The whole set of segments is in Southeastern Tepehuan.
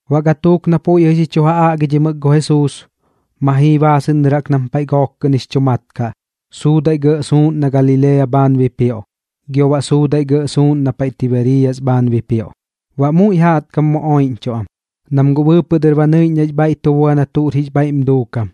Baꞌ gatuuk na puiꞌ jɨꞌ xi chu aꞌgimɨk gu Jesuus, ma jii baasɨꞌn dɨr jaꞌk nam paiꞌ gook kɨꞌn jix chu mat kaꞌ, suudaiꞌ gɇꞌ suuꞌn na Galilea bhaan bipioꞌ, gio baꞌ suudaiꞌ gɇꞌ suuꞌn na Tibeeriyas bhaan bipioꞌ. Baꞌ muiꞌ jaꞌtkam mu oiꞌñchuꞌ am, nam guꞌ bɨɨpɨꞌ dɨr ba nɨiꞌñ nax bhaiꞌ tu bua na tuꞌr jix bhaiꞌm duukam,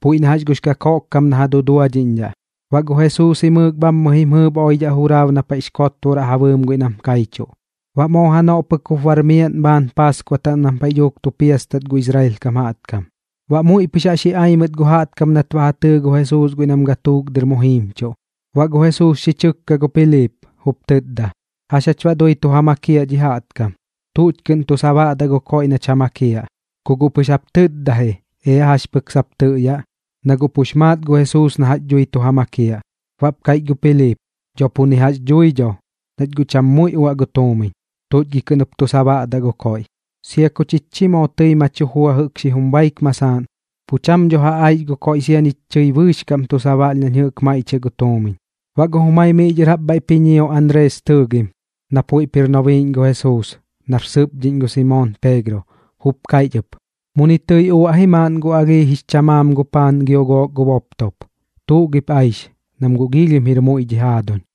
puiꞌ na jax gux kakoꞌkkam na ja duduadhiꞌñdhaꞌ. Baꞌ gu Jesuus jimɨɨk bhammɨ jim jɨɨp oidhaꞌ juraab na paiꞌx kotboraꞌ ja bɨɨm guiꞌ nam kaichuꞌ. Baꞌ moo janoꞌ pɨk jup bar miaꞌn bhaan Paaskua taꞌm nam paiꞌ dhuuk tu piastat gu Israel kam jaꞌtkam. Baꞌ muiꞌ pɨx jax ji ai mɨt gu jaꞌtkam nat ba ja tɨɨ gu Jesuus guiꞌ nam gatuuk dɨr mu jiimchuꞌ. Baꞌ gu Jesuus xi chɨkka gu Piliip, jup tɨtda: ―¿Jax jach baꞌ dui tu ja makiaꞌ dhi jaꞌtkam? ¿Tuꞌch kɨꞌn tu sabaꞌdaꞌ gu koiꞌ nach ja makiaꞌ? Ku guꞌ pɨx jap tɨtda ji, ea jax pɨk sap tɨꞌyaꞌ, na guꞌ pux maat gu Jesuus na jax dhui tu ja makiaꞌ. Baꞌp kaiꞌch gu Piliip: ―Dho pu ni jax dhui dho, nach guꞌ cham muiꞌ uaꞌ gu tuumiñ. ¿Tuꞌch gi kɨꞌn jup tu sabaꞌdaꞌ gu koiꞌ? Sia ku chich chi moo tɨi ma chu jua jɨꞌk xijum baik masaaꞌn, pu cham dho ja aix gu koiꞌ, sia ñich chi bɨɨx kaꞌm tu sabaꞌlh nañ jɨꞌk maiꞌchiaꞌ gu tuumiñ. Baꞌ gu jumai miꞌ dhɨr jaꞌp bhaiꞌp ji ñio Anrees tɨɨgim, na puiꞌp jir nobiiꞌñ gu Jesuus, nar sɨpdhiꞌñ gu Simoon Peegro, jup kaiꞌch ɨp: ―Muni tɨi uaꞌ ji maaꞌn gu alhii jix chamaam gu paan gio gook gu boptop. ¿Tuꞌ gip ja aix, nam guꞌ giilhim jir muiꞌ dhi jaaduñ?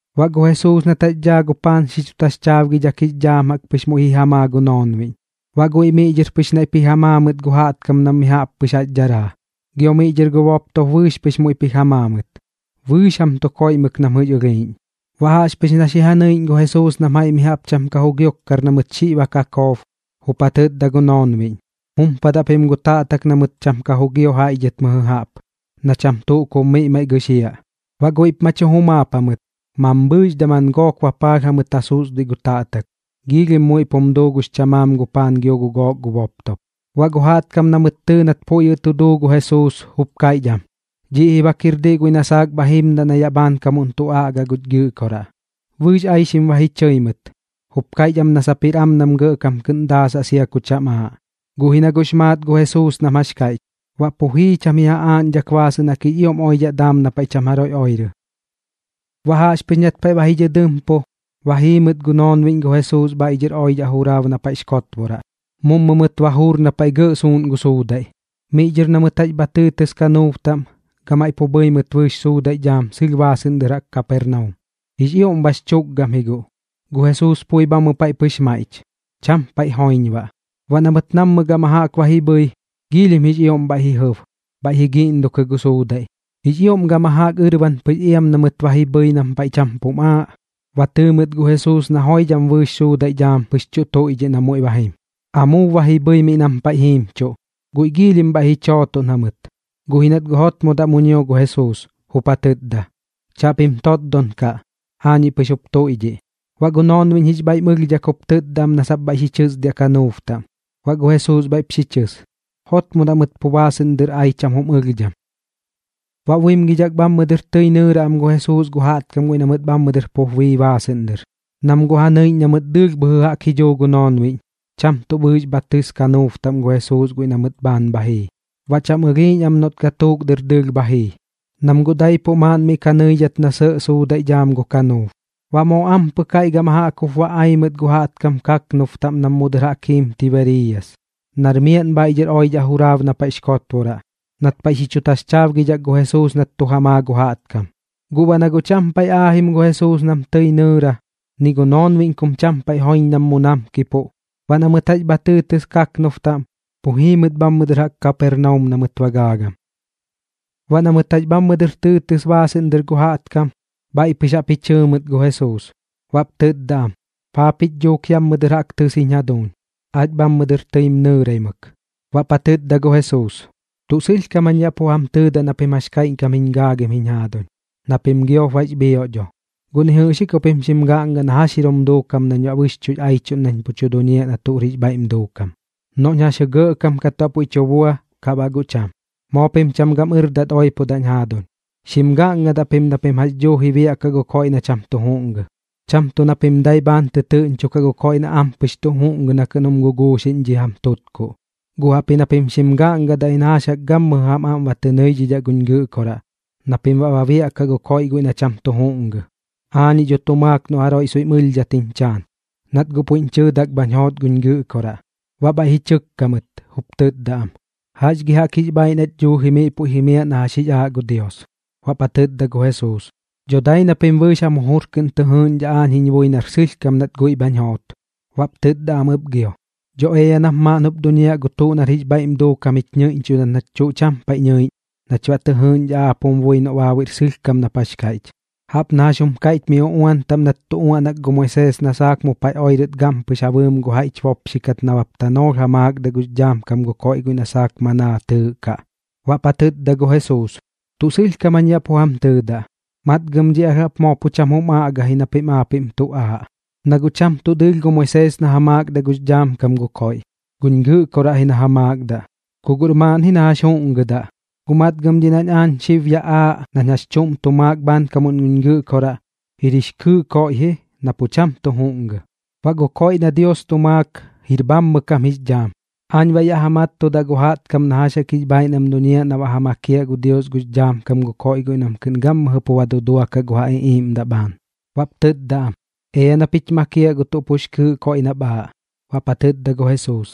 Baꞌ gu Jesuus nat jax daa gu paan xi chu taxchaabgidhak jix dhaam jaꞌk pɨx muiꞌ ji ja maa gu noonbiꞌñ. Baꞌ guiꞌ miꞌ dhɨr pɨx naiꞌp ji ja maa mɨt gu jaꞌtkam nam mi jaꞌp pɨx jaꞌx dharaa. Gio miꞌ dhɨr gu boptop bɨɨx pɨx muiꞌp ji ja maa mɨt. Bɨɨx jam tu koiꞌmɨk nam jɨꞌx ɨlhiiꞌñ. Baꞌ jaꞌxpɨx na xi ja nɨiꞌñ gu Jesuus nam jaiꞌ mi jaꞌp cham ka jugiokkar na mɨt xiꞌ ba kakoob, jup ja tɨtda gu noonbiꞌñ: ―Jumpadaꞌ pim gu taꞌtak na mɨt cham jugio jaiꞌ dhɨt mɨjɨ jaꞌp, na cham tuꞌ kub miꞌ maiꞌ gɨxiaꞌ. Baꞌ guiꞌp ma chu jumaap jamɨt, mambhɨɨx daman gook bapaalh jamɨt ja susduiꞌ gu taꞌtak. Giilhim muiꞌp jum duu gux chamaan gu paan gio gu gook gu boptop. Baꞌ gu jaꞌtkam na mɨt tɨɨ nat puiꞌ jɨꞌ tu duu gu Jesuus, jup kaiꞌch am: ―Dhiꞌ ji bak jir diꞌ guiꞌ na saak bha jimdaꞌ na yaꞌ bhaankamuꞌn tu aꞌgaꞌ guch Gɨꞌkoraꞌ. Bɨɨx aixim ba ji chɨi mɨt, jup kaiꞌch am na sap jir am nam gɇꞌkam kɨꞌn daasaꞌ sia ku cham aaꞌ. Guꞌ ji na guꞌx maat gu Jesuus nam jax kaiꞌch, baꞌ pu jii cham ji ja aaꞌñdhak baasɨꞌn jaꞌk jix ioꞌm oidhaꞌ daam na paiꞌ cham jaroiꞌ oirɨ. Baꞌ jaꞌxpɨx nat paiꞌ ba ji dhɨdɨmpu, ba jii mɨt gu noonbiꞌñ gu Jesuus bhaiꞌ dhɨr oidhaꞌ juraab na paiꞌx kotboraꞌ. Mummu mɨt ba juur na paiꞌ gɇꞌ suuꞌn gu suudaiꞌ. Miꞌ dhɨr na mɨt jax bha tɨɨtɨs kanuub taꞌm, gamaiꞌ pu bhɨi mɨt bɨɨx suudaiꞌ dhaam sɨlh baasɨꞌn dɨr jaꞌk Kapernaum. Jix ioꞌm bax chukgam ji guꞌ. Gu Jesuus pui bhammɨ paiꞌ pɨx maiꞌch, cham paiꞌ joiñ baꞌ. Baꞌ na mɨt nammɨ gama jaꞌk ba ji bhɨi, giilhim jix ioꞌm bhaiꞌ ji jɨb, bhaiꞌ ji guꞌngukɨ gu suudaiꞌ. Jix ioꞌm gama jaꞌk ɨrban pɨx iam na mɨt ba ji bhɨi nam paiꞌ cham pum aaꞌ, ba tɨɨ mɨt gu Jesuus na joidham bɨɨx suudaiꞌ dhaam pɨx tuꞌ tuiꞌdhiꞌ na muiꞌ ba jim, amuub ba ji bhɨi miꞌ nam paiꞌ jiimchuꞌ. Guiꞌ giilhim bhaiꞌ ji chootoꞌn jamɨt, guꞌ ji nat guꞌ jotmodaꞌ mu ñio gu Jesuus, jup ja tɨtda: ―¡Chaꞌpim totdon kaꞌ! Aañiꞌ pɨx jup tuiꞌdhiꞌ. Baꞌ gu noonbiꞌñ jix bhaiꞌm ɨlhdhak jup tɨtda am na bhaiꞌ xi chɨsdiaꞌ kanuub taꞌm. Baꞌ gu Jesuus bhaiꞌp xi chɨs, jotmodaꞌ mɨt pu baasɨꞌn dɨr ai cham jum ɨlhdham. Baꞌ buimgidhak bhammɨ dɨr tɨi nɨɨra am gu Jesuus gu jaꞌtkam guiꞌ na mɨt bhammɨ dɨr pup bii baasɨꞌn dɨr, nam guꞌ ja nɨiꞌñ na mɨt dɨɨlh bhɨjɨ jaꞌk ji dhuu gu noonbiꞌñ, cham tuꞌ bɨɨx bha tɨs kanuub taꞌm gu Jesuus guiꞌ na mɨt bhaan bha jii. Baꞌ cham ɨlhiiꞌñ am noꞌt gatuuk dɨr dɨɨlh bha jii, nam guꞌ daipuꞌ maaꞌn miꞌ ka nɨidhat na sɇꞌ suudaiꞌ dhaam gu kanuub. Baꞌ moo ampɨk jaiꞌ gama jaꞌk jup ba ai mɨt gu jaꞌtkam kaknub taꞌm nam mu dɨr jaꞌk jiim Tibeeriyas, nar miaꞌn bhaiꞌ dhɨr oidhaꞌ juraab na paiꞌx kotboraꞌ, nat paiꞌ xi chu taxchaabgidhak gu Jesuus nat tu ja maa gu jaꞌtkam. Guꞌ baꞌ na guꞌ cham paiꞌ aajim gu Jesuus nam tɨi nɨɨra, ni gu noonbiꞌñ kum cham paiꞌ joiñ nam mu namkipuꞌ, baꞌ na mɨt jax bha tɨɨtɨs kaknub taꞌm, pu jii mɨt bhammɨ dɨr jaꞌk Kapernaum na mɨt ba gaagam. Baꞌ na mɨt jax bhammɨ dɨr tɨɨtɨs baasɨꞌn dɨr gu jaꞌtkam, bhaiꞌ pɨx jaꞌp ji chɨɨ mɨt gu Jesuus, baꞌp tɨtda am: ―¿Paa pich dhuuk yammɨ dɨr jaꞌk tɨs jiñ jaduuñ? Aach bhammɨ dɨr tɨim nɨɨraimɨk. Baꞌp ja tɨtda gu Jesuus: ―Tuꞌ sɨlhkam jañ yaꞌ pu jam tɨɨdaꞌ na pim jax kaiꞌñkam jiñ gaagim jiñ jaaduñ, na pim giop bax bhioꞌ dho. Guꞌ ni jɨꞌx ji ku pim xim gaꞌnga na jax jir jum duukam nañ baꞌ bɨxchuꞌx aichuꞌn nañ pu tu duñiaꞌ na tuꞌr jix bhaiꞌm duukam, noꞌñ jaxjɨ gɇꞌkam kat baꞌ puiꞌ tu bua, kaꞌ baꞌ guꞌ cham. Moo pim cham gam ɨrdat oipodaꞌñ jaaduñ. Xim gaꞌngadaꞌ pim na pim jax jaꞌk duuji biaꞌkaꞌ gu koiꞌ na cham tu juꞌngɨ, cham tuꞌ na pim dai bhaan tɨtɨɨꞌñchokaꞌ gu koiꞌ na ampɨx tu juꞌngɨ na kɨꞌn jum guguuxiꞌñ dhi jam tutkuꞌ. Guꞌ jaꞌpji na pim xim gaꞌngadaꞌ ji na jax jaꞌk gammɨjɨ jam aꞌm ba tɨ nɨidhidhaꞌ guñ Gɨꞌkoraꞌ na pim baꞌ ba biaꞌkaꞌ gu koiꞌ guiꞌ na cham tu juꞌngɨ. Aañiꞌ dho tu maak noꞌ jaroiꞌ soiꞌm ɨlhdhat jiñ chaan, nat guꞌ puiꞌñ chɨɨdak bhañ joot guñ Gɨꞌkoraꞌ. Baꞌ bhaiꞌ ji chɨkka mɨt, jup tɨtda am: ―¿Jax gi jaꞌk jix bhaaiꞌ nach dhuuji miꞌ puiꞌ jimiaꞌ na jax jix aaꞌ gu Dios? Baꞌp ja tɨtda gu Jesuus: ―Dho dai na pim bɨɨx jam jujur kɨꞌn tɨ jɨɨgiꞌñdhaꞌ aañ jiñ bui nar sɨlhkam nat guiꞌ bhañ joot. Baꞌp tɨtda am ɨp gio: ―Dho ea nap maaꞌn jup duñiaꞌ gu tuꞌ nar jix bhaiꞌm duukam jich ñɨiꞌñchudat nach tuꞌ cham paiꞌ nɨiꞌñ, nach baꞌ tɨ jɨɨgiꞌñdhaꞌ aap jum bui noꞌ baabuiꞌr sɨlhkam nap jax kaiꞌch. Jaꞌp na jax jum kaiꞌch mi uꞌuan taꞌm nat tu uaꞌnak gu Moisees na saak mu paiꞌ oirɨt gampɨx ja bɨɨm gu jaiꞌch bopxikat nabap tanoolh ja maakdaꞌ gux dhaam kam gu koiꞌ guiꞌ na saak manaa tɨɨꞌkaꞌ. Baꞌp ja tɨtda gu Jesuus: ―Tuꞌ sɨlhkam jañ yaꞌ pu jam tɨɨdaꞌ, matgam dhiꞌ alh jaꞌp moo pu cham jum aꞌga ji na pim aapiꞌm tuꞌ aaꞌ. Na guꞌ cham tuꞌ dɨɨlh gu Moisees na ja maakdaꞌ gux dhaam kam gu koiꞌ, guñ Gɨꞌkoraꞌ ji na ja maakdaꞌ, ku guꞌr maaꞌn ji na jax juꞌngɨdaꞌ. Guꞌ matgam dhiꞌ nañ aañ xib yaꞌ aaꞌ nañ jax chuꞌm tu maak bhaankamuꞌn guñ Gɨꞌkoraꞌ, jir jix kɨɨꞌ koiꞌ ji na pu cham tu juꞌngɨ. Baꞌ gu koiꞌ na Dios tu maak, jir bhammɨ kam jix dhaam. Aañ baꞌ yaꞌ ja mattudaꞌ gu jaꞌtkam na jax jaꞌk jix bhaaiꞌ nam duñiaꞌ na baꞌ ja makiaꞌ gu Dios gux dhaam kam gu koiꞌ guiꞌ nam kɨꞌn gammɨjɨ pu ba duduakaꞌ gu ja iꞌiiꞌmdaꞌ bhaan. Baꞌp tɨtda am: ―Ea nap jich makiaꞌ gu tuꞌ pux kɨɨꞌ koiꞌ nap aaꞌ. Baꞌp ja tɨtda gu Jesuus: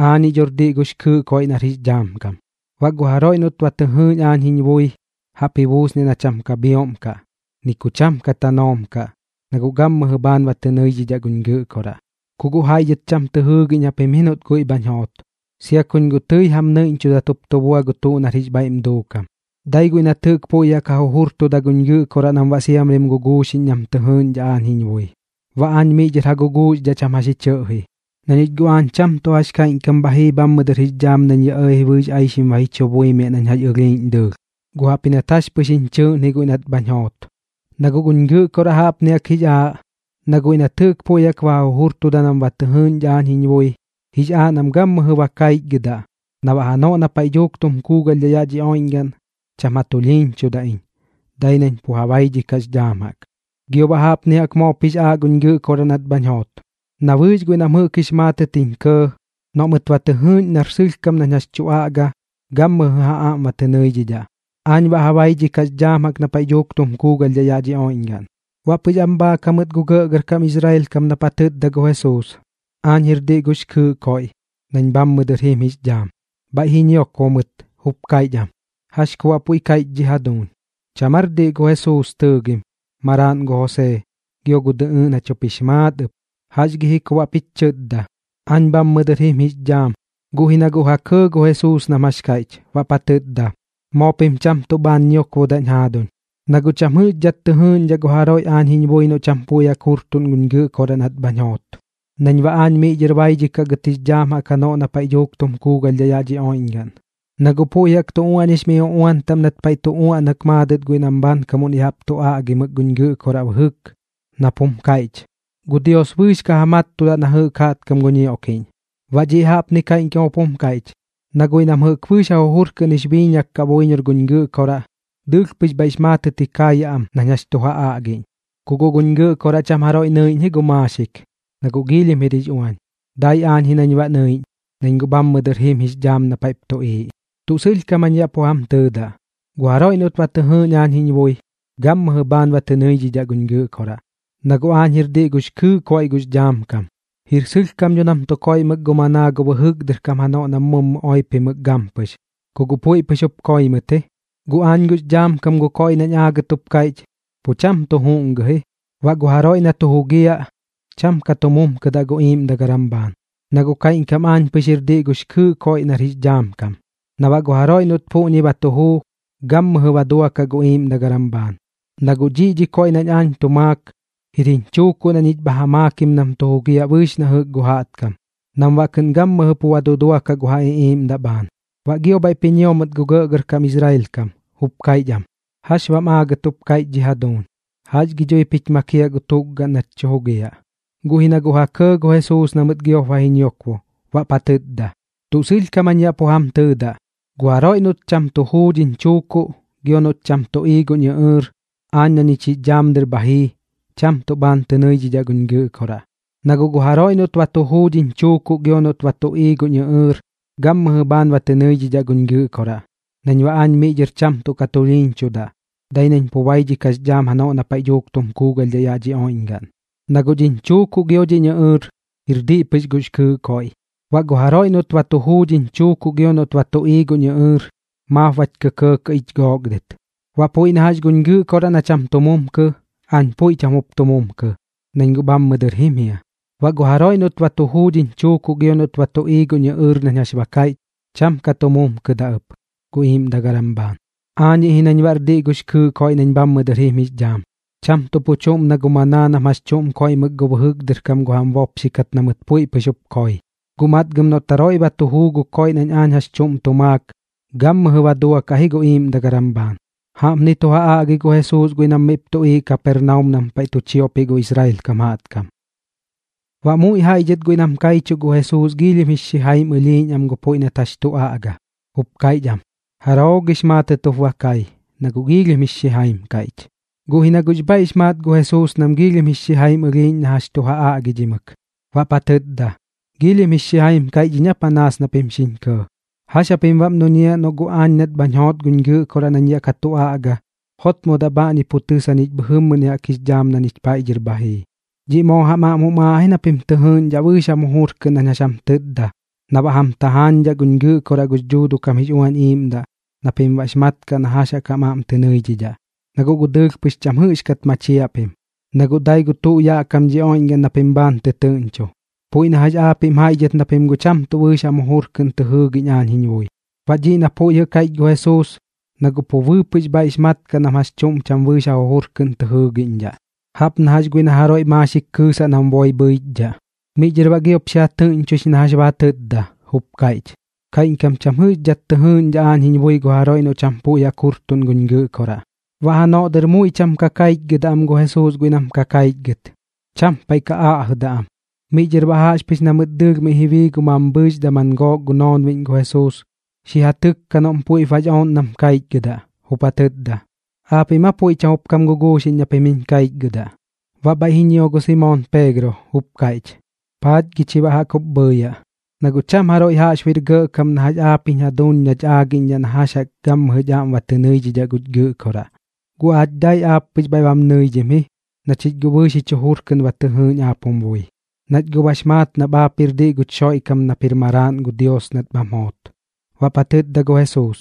―Aañiꞌ dhor diꞌ gux kɨɨꞌ koiꞌ nar jix dhaam kam. Baꞌ gu jaroiꞌ noꞌt ba tɨ jɨɨꞌñ aañ jiñ bui, jaꞌp ji buusniaꞌ na cham ka bhioꞌm kaꞌ, ni ku cham ka tanoom kaꞌ, na guꞌ gammɨjɨ bhaan ba tɨ nɨidhidhaꞌ guñ Gɨꞌkoraꞌ. Ku guꞌ jaiꞌ dhɨt cham tɨ jɨɨgiꞌñ japim ji noꞌt guiꞌ bhañ joot, sia kuñ guꞌ tɨi jam nɨiꞌñchudat jup tu bua na tuꞌr jix bhaiꞌm duukam. Dai guiꞌ nat jɨꞌk puiꞌ jaꞌk ja jujurtuda guñ Gɨꞌkoraꞌ nam baꞌ siamrim guguuxiꞌñ nam tɨ jɨɨꞌñdhaꞌ aañ jiñ bui, baꞌ aañ miꞌ dhɨr ja guguuxdhaꞌ cham jax ji chɨꞌji. Na ñich guꞌ aañ cham tuꞌ jax kaiꞌñkam bha jii bhammɨ dɨr jix dhaam nañ yaꞌ ɇɇji bɨɨx aixim ba ji chu buimiaꞌ nañ jax ɨlhiiꞌñ dɨɨlh, guꞌ jaꞌpji nat jax pɨx jiñ chɨɨꞌn ji guiꞌ nat bhañ joot. Na guꞌ guñ Gɨꞌkoraꞌ jaꞌpni jaꞌk jix aaꞌ, na guiꞌ nat jɨꞌk puiꞌ jaꞌk ba ja jujurtuda nam ba tɨ jɨɨꞌñdhaꞌ aañ jiñ bui, jix aaꞌ nam gammɨjɨ bañ kaichgɨdaꞌ, na baꞌ janoꞌ na paiꞌ dhuuk tum kuugalhdhaꞌ yaꞌ dhi oiꞌñgaꞌn, cham ja tulhiiñchudaꞌ iñ, dai nañ pu ja baidhikaꞌx dhaam jaꞌk. Gio baꞌ jaꞌpni jaꞌk moop jix aaꞌ guñ Gɨꞌkoraꞌ nat bhañ joot, na bɨɨx guiꞌ nam jɨꞌk jix maatɨt jiñ kɇɇ, noꞌ mɨt ba tɨ jɨɨꞌñ nar sɨlhkam nañ jax tu aꞌgadaꞌ, gammɨjɨ ja aꞌm ba tɨ nɨidhidhaꞌ. Aañ baꞌ ja baidhikaꞌx dhaam jaꞌk na paiꞌ dhuuk tum kuugalhdhaꞌ yaꞌ dhi oiꞌñgaꞌn. Baꞌ pɨx am bhaak jamɨt gu gɇꞌgɇrkam Israel kam nap ja tɨtda gu Jesuus: “Aañ jir diꞌ gux kɨɨꞌ koiꞌ, nañ guꞌ bhammɨ dɨr jim jix dhaam.” Bhaiꞌ ji ñiokbo mɨt, jup kaiꞌch am: ―¿Jax ku baꞌ puiꞌ kaiꞌch dhi jaduuñ? ¿Cham aar diꞌ gu Jesuus tɨɨgim, maraaꞌn gu Josee, gio gu dɨꞌɨɨꞌn jach jup jix maat ɨp? ¿Jax gi ji ku baꞌp jich chɨtda: “Aañ bhammɨ dɨr jim jix dhaam”? Guꞌ ji na guꞌ ja kɇɇ gu Jesuus nam jax kaiꞌch, baꞌp ja tɨtda: ―Moo pim cham tuꞌ bhaan ñiokbodaꞌñ jaaduñ. Na guꞌ cham jɨꞌxkat tɨ jɨɨꞌñdhaꞌ gu jaroiꞌ aañ jiñ bui noꞌ cham puiꞌ jaꞌk jurtuꞌn guñ Gɨꞌkoraꞌ nat bhañ joot, nañ baꞌ aañ miꞌ dhɨr baidhikaꞌ gɨt jix dhaam jaꞌk janoꞌ na paiꞌ dhuuk tum kuugalhdhaꞌ yaꞌ dhi oiꞌñgaꞌn. Na guꞌ puiꞌ jaꞌk tu uaꞌñix mi uꞌuan taꞌm nat paiꞌ tu uaꞌnak maadɨt guiꞌ nam bhaankamuꞌn ya jaꞌp tu aꞌgimɨk guñ Gɨꞌkoraꞌ bɨjɨk, nap jum kaiꞌch: “Gu Dios bɨɨx ka ja mattudaꞌ na jɨꞌk jaꞌtkam gu ñioꞌkiꞌñ.” Baꞌ dhiꞌ jaꞌpni kaiꞌñkam jup jum kaiꞌch, na guiꞌ nam jɨꞌk bɨɨx ja jujur kɨꞌn jix biiñak kaꞌ buiñor guñ Gɨꞌkoraꞌ, dɨɨlh pɨx bhaiꞌx maatɨt ji kaayaꞌ am nañ jax tu ja aꞌgiꞌñ. ’Ku guꞌ guñ Gɨꞌkoraꞌ cham jaroiꞌ nɨiꞌñ ji gu maaxik, na guꞌ giilhim jir jix uañ. Dai aañ ji nañ baꞌ nɨiꞌñ, nañ guꞌ bhammɨ dɨr jim jix dhaam na paiꞌp tuꞌiiꞌ. Tuꞌ sɨlhkam jañ yaꞌ pu jam tɨɨdaꞌ, gu jaroiꞌ noꞌt ba tɨ jɨɨꞌñ aañ jiñ bui, gammɨjɨ bhaan ba tɨ nɨidhidhaꞌ guñ Gɨꞌkoraꞌ, na guꞌ aañ jir diꞌ gux kɨɨꞌ koiꞌ gux dhaam kam. Jir sɨlhkam dho nam tu koiꞌmɨk gu manaa gu bɨjɨk dɨr kam janoꞌ nam mummu oipimɨk gampɨx, ku guꞌ puiꞌ pɨx jup koi mɨt ji. Guꞌ aañ gux dhaam kam gu koiꞌ nañ aagɨt jup kaiꞌch, pu cham tu juꞌngɨ ji. Baꞌ gu jaroiꞌ na tu jugiaꞌ, cham ka tu mumkɨdaꞌ gu iiꞌmdagaram bhaan. Na guꞌ kaiꞌñkam aañ pɨx jir diꞌ gux kɨɨꞌ gu koiꞌ nar jix dhaam kam, na baꞌ gu jaroiꞌ noꞌt puꞌñi ba tu juu, gammɨjɨ ba duakaꞌ gu iiꞌmdagaram bhaan. Na guꞌ dhiꞌñi dhi koiꞌ nañ aañ tu maak, jir jiñ chuukuꞌ na ñich bha ja maakim nam tu jugiaꞌ bɨɨx na jɨꞌk gu jaꞌtkam, nam baꞌ kɨꞌn gammɨjɨ pu ba duduakaꞌ gu ja iꞌiiꞌmdaꞌ bhaan. Baꞌ gio bhaiꞌp ji ñio mɨt gu gɇꞌgɇrkam Israel kam, jup kaiꞌch am: ―¿Jax baꞌm aagɨt jup kaiꞌch dhi jaduuñ? ¿Jax gi dhuip jich makiaꞌ gu tukgaꞌn nach tu jugiaꞌ? Guꞌ ji na guꞌ ja kɇɇ gu Jesuus na mɨt giop ba ji ñiokbo, baꞌp ja tɨtda: ―Tuꞌ sɨlhkam jañ yaꞌ pu jam tɨɨdaꞌ, gu jaroiꞌ noꞌt cham tu juu dhiñ chuukuꞌ gio noꞌt cham tu ii guñ ɨꞌɨɨr, aañ na ñich jix dhaam dɨr bha jii, cham tuꞌ bhaan tɨ nɨidhidhaꞌ guñ Gɨꞌkoraꞌ. Na guꞌ gu jaroiꞌ noꞌt ba tu juu dhiñ chuukuꞌ gio noꞌt ba tu ii guñ ɨꞌɨɨr, gammɨjɨ bhaan ba tɨ nɨidhidhaꞌ guñ Gɨꞌkoraꞌ, nañ baꞌ aañ miꞌ dhɨr cham tuꞌ ka tulhiiñchudaꞌ, dai nañ pu baidhikaꞌx dhaam janoꞌ na paiꞌ dhuuk tum kuugalhdhaꞌ yaꞌ dhi oiꞌñgaꞌn. Na guꞌ dhiñ chuukuꞌ gio dhiñ ɨꞌɨɨr, jir diꞌ pɨx gux kɨɨꞌ koiꞌ. Baꞌ gu jaroiꞌ noꞌt ba tu juu dhiñ chuukuꞌ gio noꞌt ba tu ii guñ ɨꞌɨɨr, maap bach kɇkɇɇkɇꞌ ich gook dɨt. Baꞌ puiꞌ na jax guñ Gɨꞌkoraꞌ na cham tu mumkɨ, aañ puiꞌ cham jup tu mumkɨ, nañ guꞌ bhammɨ dɨr jim jia. Baꞌ gu jaroiꞌ noꞌt ba tu juu dhiñ chuukuꞌ gio noꞌt ba tu ii guñ ɨꞌɨɨr nañ jax ba kaiꞌch, cham ka tu mumkɨdaꞌ ɨp gu iiꞌmdagaram bhaan. Aañiꞌ ji nañ baꞌr diꞌ gux kɨɨꞌ koiꞌ nañ bhammɨ dɨr jim jix dhaam, cham tuꞌ pu chuꞌm na gu manaa nam jax chuꞌm koiꞌmɨk gu bɨjɨk dɨr kam gu jam bopxikat na mɨt puiꞌ pɨx jup koi. Guꞌ matgam noꞌt jaroiꞌ ba tu juu gu koiꞌ nañ aañ jax chuꞌm tu maak, gammɨjɨ ba duakaꞌ ji gu iiꞌmdagaram bhaan. Jaꞌpni tu ja aꞌgi gu Jesuus guiꞌ nam miꞌp tuꞌiiꞌ Kapernaum nam paiꞌ tu chiopiꞌ gu Israel kam jaꞌtkam. Baꞌ muiꞌ jaiꞌ dhɨt guiꞌ nam kaichuꞌ gu Jesuus giilhim jix xijaim ɨlhiiꞌñ am gu puiꞌ nat jax tu aꞌga, jup kaiꞌch am: ―¿Jaroo gix maatɨt jup ba kai, na guꞌ giilhim jix xijaim kaiꞌch? Guꞌ ji na guꞌx bhaiꞌx maat gu Jesuus nam giilhim jix xijaim ɨlhiiꞌñ na jax tu ja aꞌgidhimɨk, baꞌp ja tɨtda: ―¿Giilhim jix xijaim kaiꞌch iñ aa panaas na pim xiñ kɇɇ? ¿Jax japim baꞌm duñiaꞌ noꞌ guꞌ aañ nat bhañ joot guñ Gɨꞌkoraꞌ nañ yaꞌ ka tu aꞌga, jotmodaꞌ bhaꞌñi pu tɨs jañich bhɨjɨmmɨni jaꞌk jix dhaam na ñich paiꞌ dhɨr bha jii? Dhiꞌ moo jam aꞌm jum aaꞌ ji na pim tɨ jɨɨꞌñdhaꞌ bɨɨx jam jujur kɨꞌn nañ jax jam tɨtda na baꞌ jam tajaañdhaꞌ guñ Gɨꞌkoraꞌ gux Dhuuduꞌ kam jix Uañ Iiꞌmdaꞌ na pim baꞌx mat kaꞌ na jax jaꞌk jam aꞌm tɨ nɨidhidhaꞌ. Na guꞌ gu dɨɨlh pɨx cham jɨꞌxkat machiaꞌ pim, na guꞌ dai gu tuꞌ yaꞌ kam dhi oiꞌñgaꞌn na pim bhaan tɨtɨɨꞌñcho. Puiꞌ na jax aapiꞌm jaiꞌ dhɨt na pim guꞌ cham tuꞌ bɨɨx jam jujur kɨꞌn tɨ jɨɨgiꞌñ aañ jiñ bui. Baꞌ dhiꞌ na puiꞌ jɨꞌ kaiꞌch gu Jesuus, na guꞌ bɨɨpɨꞌ pux bhaiꞌx mat kaꞌ nam jax chuꞌm cham bɨɨx ja jujur kɨꞌn tɨ jɨɨgiꞌñdhaꞌ, jaꞌp na jax guiꞌ na jaroiꞌ maaxik kɨɨsaꞌ nam boi bhɨichdhaꞌ. Miꞌ dhɨr baꞌ giop xi ja tɨꞌñchoix na jax ba ja tɨtda, jup kaiꞌch: ―Kaiꞌñkam cham jɨꞌxkat tɨ jɨɨꞌñdhaꞌ aañ jiñ bui gu jaroiꞌ noꞌ cham puiꞌ jaꞌk jurtuꞌn guñ Gɨꞌkoraꞌ. Baꞌ janoꞌ dɨr muiꞌ cham ka kaichgɨdaꞌ am gu Jesuus guiꞌ nam ka kaichgɨt, cham paiꞌ ka aꞌjɨdaꞌ am. Miꞌ dhɨr baꞌ jaꞌxpɨx na mɨt dɨɨlh miꞌ ji bii gu mambhɨɨx daman gook gu noonbiꞌñ gu Jesuus, xi ja tɨkka noꞌm puiꞌp bax ooꞌn nam kaichgɨdaꞌ, jup ja tɨtda: ―¿Aapiꞌm aa puiꞌ cham jup kam guguuxiꞌñ na pim jiñ kaichgɨdaꞌ? Baꞌ bhaiꞌ ji ñio gu Simoon Peegro, jup kaiꞌch: ―¿Paach gi chi baꞌ jaꞌk jup bhɨɨyaꞌ? Na guꞌ cham jaroiꞌ jaꞌxbuiꞌr gɇꞌkam na jax aap jich jaduuñ nach aagiꞌñdhaꞌ na jax jaꞌk gammɨjɨch aꞌm tɨ nɨidhidhaꞌ guch Gɨꞌkoraꞌ. Guꞌ aach dai aap pɨx bhaiꞌ bam nɨidhim ji, na chich guꞌ bɨɨx jich jujur kɨꞌn ba tɨ jɨɨꞌñ aap jum bui, nach guꞌ bax maat nap aap jir diꞌ guch Xoiꞌkam nap jir Maraaꞌn gu Dios nat bham joot. Baꞌp ja tɨtda gu Jesuus: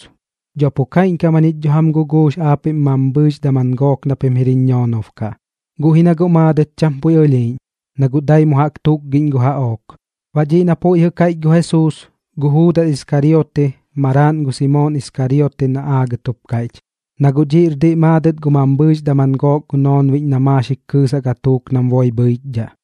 ―Dho pu kaiꞌñkam jañich dho jam guguux aapiꞌm mambhɨɨx daman gook na pim jir jiñ ñoonob kaꞌ. Guꞌ ji na guꞌ maadɨt cham puiꞌ ɨlhiiꞌñ, na guꞌ dai mu jaꞌk tukgiꞌñ gu jaꞌook. Baꞌ dhiꞌ na puiꞌ jɨꞌ kaiꞌch gu Jesuus, gu Juudas Iskariote maraaꞌn gu Simoon Iskariote na aagɨt jup kaiꞌch, na guꞌ dhiꞌr diꞌ maadɨt gu mambhɨɨx daman gook gu noonbiꞌñ na maaxik kɨɨsaꞌ gatuuk nam boi bhɨichdhaꞌ.